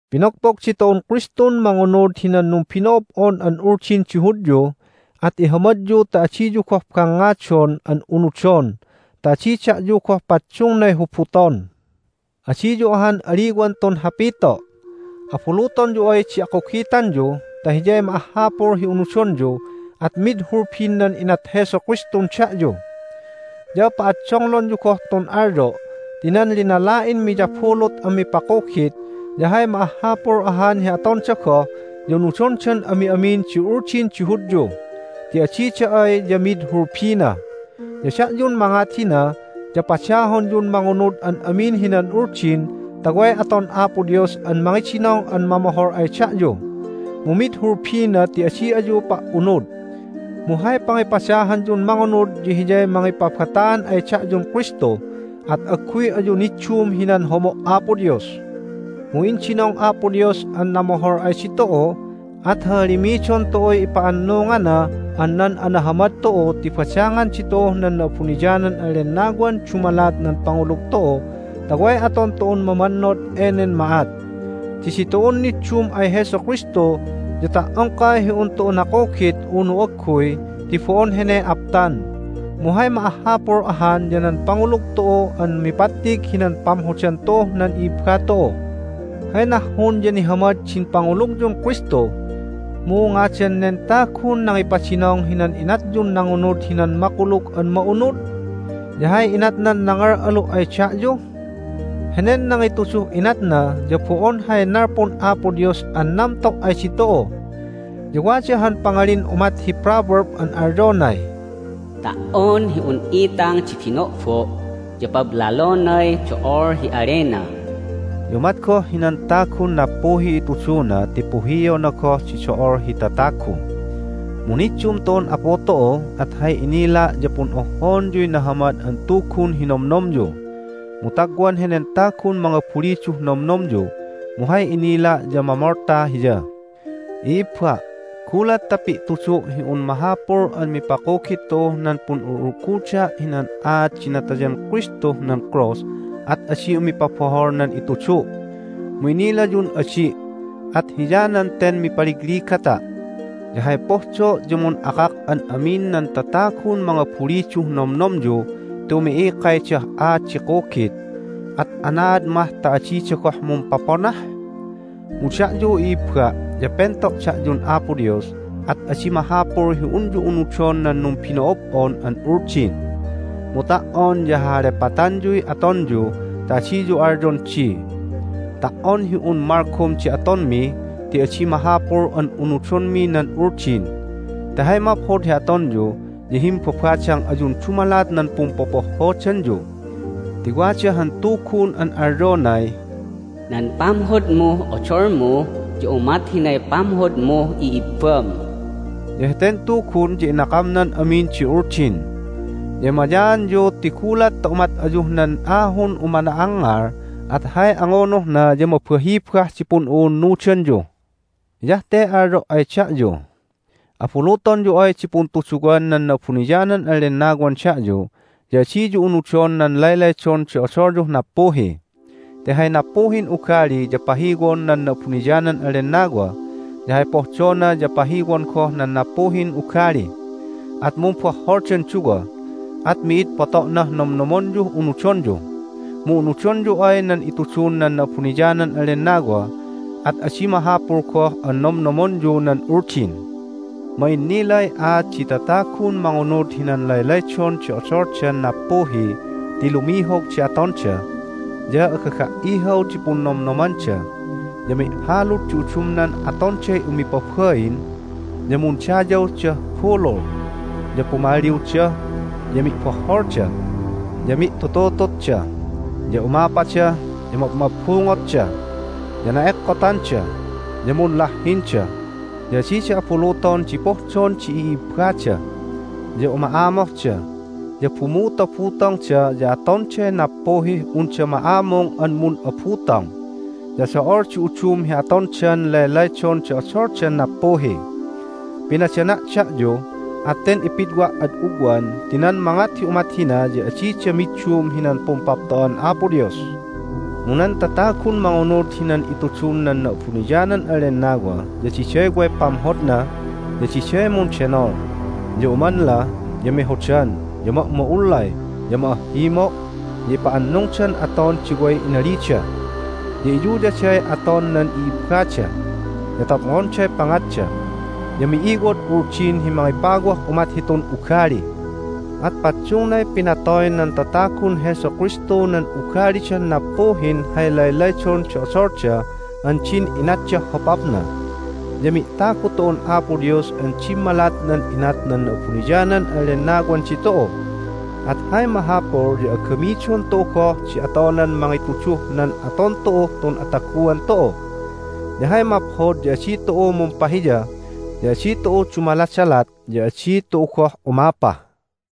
Pinogpog ditu'un Kristun mangunud hinan numbino'ob'on an Uldin di Hudyu, at ihamadyu ta adiyu goh bangngadon an unudon, ta adi da'yu goh paddungnay hubuton. Adiyu ahan aliwan tun hapito': Abulutonyu ay di akugitanyu ta hiyay ma'ahhapul hi unudonyu at mid hulbin nan inat Jesu Kristun da'yu! Ya pa'addonglonyu goh tun alyo' ti nan linala'in miyabulut an mipakugit ya hay ma'ahhapul ahan hi atonda goh ya unudondan ami'amin di Uldin di Hudyu. Ti adida ay ya mid hulbina. Ya da'yun mangat hina ya padahonyun mangunud an amin hinan Uldin ta way aton Apo Dios an mangidinong an mamohol ay da'yu. Mu mid hulbina ti adi ayu pa"unud! Mu hay pangipadahanyun mangunud ya hiyay mangipabataan ay da'yun Kristu, at agguy ayu niddum hinan homo' Apo Dios! Mu indinong Apo Dios an namohol ay ditu'u, at hahalimidon tu'uy ipa'annungan nan anahamad tu'u ti badangan ditu'uh nan Na'abuniyanan an Lennawan dumalat nan pangulug tu'u ta way aton tu'un mamannod enen ma'at. Ti ditu'un niddum ay Jesu Kristu ya ta"ongkay hi un tu'u nakugit unu agguy ti bo'on heney aptan. Mu hay ma'ahhapul ahan ya nan pangulug tu'u an mipattig hinan pamhodan tu'uh nan i'ibba tu'u. Hay nahhun ya nihamad din pangulugyun Kristu. Mu ngadan nen tagun nangipadinong hinan inatyun nangunud hinan Makulug an Ma'unud? Ya hay inatnan nangal'alu' ay da'yu? Henen nangituduh inatna ya bo'on hay nalpun Apo Dios an namto' ay ditu'u. Ya wada han pangalin umat hi proverb an alyonay, "Ta"on hi un itang di bino'bo' ya pablalonay do'ol hi alena." Ya umat goh hinan tagun nappuhiy ituduna ti puhiona goh di do'ol hi tatagu. Mu niddum tu'un Apu tu'u, at hay inila' ya pun'ohhoonyuy Nahamad an Tugun hi nomnomyu. Mu tagwan henen tagun mangabuliduh nomnomyu, mu hay inila' ya mamolta hiya. I'ibba', gulat ta pi'tudu' hi un mahapul an mipakugit tu'uh nan pun'ul'ulguda' hinan aat di natayan Kristuh nan krus at adi umipabohol nan itudu'. Mu inilayun adi', at hiyanan ten mipaligligata'. Ya hay pohdo' ya mun'akak an amin nan tatagun mangabuliduh nomnomyu ti umi'ikaydah aat di kugit, at anaad mah ta adida goh mumpaponah? Mu da'yu, i'ibba', ya pento' da'yun Apo Dios, at adi mahapul hi unyu unudon nan numbino'ob'on an Uldin. Mu ta"on ya hahalepatanyuy atonyu ta adiyu alyon di, "Ta"on hi un malgom di atonmi ti adi mahapul an unudonmi nan Uldin!" Ti hay maphod hi atonyu ya himbabadang ayun dumalat nan pumpopohhodanyu. Ti wada han tugun an alyonay, "Nan pamhodmuh odolmu ya umat hinay pamhodmuh i'ibbam." Ya heten tugun ya inakamnan amin di Uldin. Ya emayaanyu ti gulat ta umat ayuh nan ahun umana'angngal at hay angunuhna ya mabahibah di pun'u'unnudanyu! Hiyah te alyo' ay da'yu: Abulutonyu ay di puntuduwan nan Na'abuniyanan an Lennawan da'yu ya adiyu unudon nan laylaydon di odolyuh nappuhi. Ti hay nappuhin ugali ya pahiwon nan Na'abuniyanan an Lennawa, ya hay pohdona ya pahiwon goh nan nappuhin ugali, at mumbohholdan duwa, at mi'id poto'nah nomnomonyuh unudonyu. Mu unudonyu ay nan itudun nan Na'abuniyanan an Lennawa at adi mahapul goh an nomnomonyu nan Uldin. Ma'innilay aat di tatagun mangunud hinan laylaydon di odoldan nappuhi ti lumihog di atonda, ya agaga"ihaw di punnomnomanda, ya mi'halud di udumnan atonday umipabain, ya mundayawdah bulul, ya pumalliwda, ya mi'bohholda, ya mi'tututututda, ya umapada, ya mabmabbungotda, ya na'ekkotanda, ya munlahhinda, ya adida abuluton di pohdon di i'ibbada, ya uma'amohda, ya bumutobutongda, ya atonday nappuhih unda ma'amung an mun'abutong, ya do'ol di udum hi atondan laylaydon di odoldan nappuhi. Pinadana' da'yu, at ten ipidwa' ad ugwan ti nan mangat hi umat hina ya adida middum hinan Pumpapto'an Apo Dios. Mu nan tatagun mangunud hinan itudun nan Na'abuniyanan an Lennawa ya diday way pamhodna, ya diday mundenol, ya umanla, ya mehodan, ya ma'ma'ullay, ya ma'ahhimo', ya ipa'annungdan aton di way inalida, ya iyuyaday aton nan i'ibbada, ya topngonday pangatda. Ya mi'iwod Uldin hi mangipawah umat hitun ugali. At paddungnay pinatoy nan tatagun Jesu Kristu nan ugalidan nappuhin hay laylaydon di odolda an din inatdah hopapna, ya mi'tagu tu'un Apo Dios an dimmalat nan inat nan Na'abuniyanan an Lennawan ditu'u. At hay mahapul ya agamidon tu'u goh di atonan mangituduh nan aton tu'uh tun ataguan tu'u. Ya hay maphod ya adi tu'u mumpahiya, ya adi tu'u dumaladalat, ya adi tu'u goh umapa.